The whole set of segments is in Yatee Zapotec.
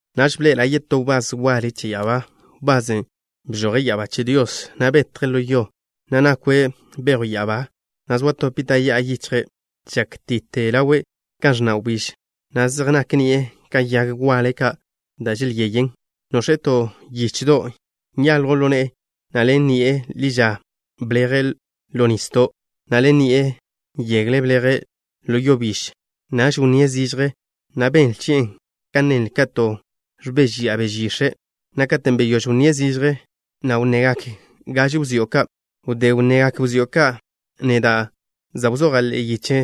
Naž bḻe'ela' yetó wbás waḻe che ya'abá, wbasen' bžoje' ya'abá che Dios, na' betje' ḻo yo, na' nakwe' bejw ya'abá, na' zoa to pita' ya'a yichjle'. Žákti'te ḻawe' kan ẕnna' wbíž, na' zej nak ni'e ka yag waḻe ka' da' želyeyen. Nox̱e' to yichdo' nyaljwn ḻo ne'e, na' ḻen ni'e ḻi ža bleje' ḻo nisdo', na' ḻen ni'e yegle bleje' ḻo yo biž. Naž wnníe' zižje, na' benle chi'e kan nenle kate' ẕbežya'a beže yix̱e', na' katen' beyóž wnníe' zižje, na' wnnegak gaže wzió' ka'. Wdé wnnegak wzió' ka', neda' za' wzoja' ḻe'e yiche,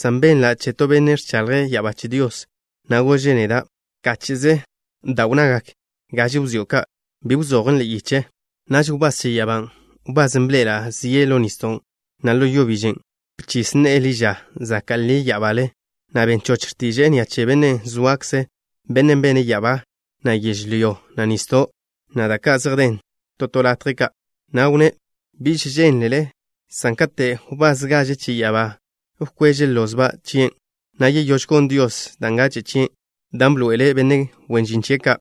san benla' che to benne' ẕchaḻje' ya'abá che Dios, na' gože' neda': “Bkáche'ze da' wnnagak gaže wzió' ka'. Bi wzojon' ḻe'e yiche.” Naž wbás che ya'abán', wbasen' bḻe'ela' zie' ḻo nisdo', na' ḻo yo biž, bchis ne'e ḻi ža zaka' ḻi ya'abale, na' ben choch x̱tiže'e ni'a che Bennen' zoakze', Bennen' bene' ya'abá, na' yežlyó, na' nisdo', na' da' ka' zej den to to latje ka', na' wnné': “Biž žeḻen, san kate' wbás gaže che ya'abá wkweže' lozba' chien', na' yeyóž gon Dios da' ngache' chie', dan' bḻoe'ele' benne' wen žin chie' ka',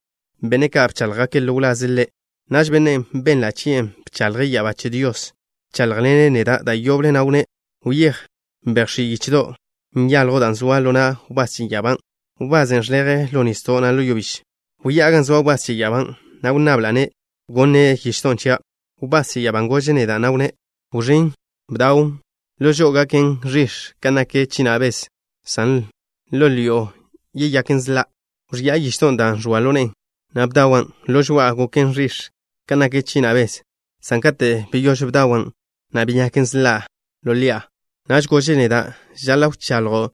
benne' ka' bcháḻjgake' ḻo wlaze' Ḻe'.” Naž bennen' benla' chie' bchaḻje' ya'abá che Dios bcháḻjḻene' neda' da' yoble, na' wnné': “Wyéj, bejx̱í' yichdo' nyaljwn', dan' ẕoan ḻo na' wbás che ya'abán', wbasen' žleje' ḻo nisdo', na' ḻo yo biž.” Wyá'a gan zoa wbás che ya'abán', na' wnnabla'-ne' gonne' yichdon' chia'. Wbás che ya'abán' gože' neda', na' wnné': “Wẕín', bdawn'. Ḻo žo'o gaken ẕix̱ kan nak china' bez, san ḻo ḻi'o yeyaken sḻa'.” Wẕi'a yichdon' dan' ẕoan ḻo ne'e, na' bdawan'. Ḻo žoa'a goken ẕix̱ kan nak china' bez, san katen' beyóž bdawan', na' beyaken sḻa' ḻo ḻi'a. Naž gože' neda': “Žaḻa' wchaḻjo'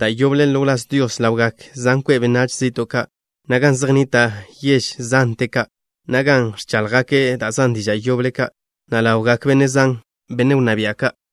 da' yoble ḻo wláz Dios ḻawgak zan kwe' benách zi'to' ka', na' gan zej nnita' yež zante ka', na' gan ẕcháḻjgake' da' zan diža' yoble ka', na' ḻawgak benne' zan, benne' wnná bia' ka'.”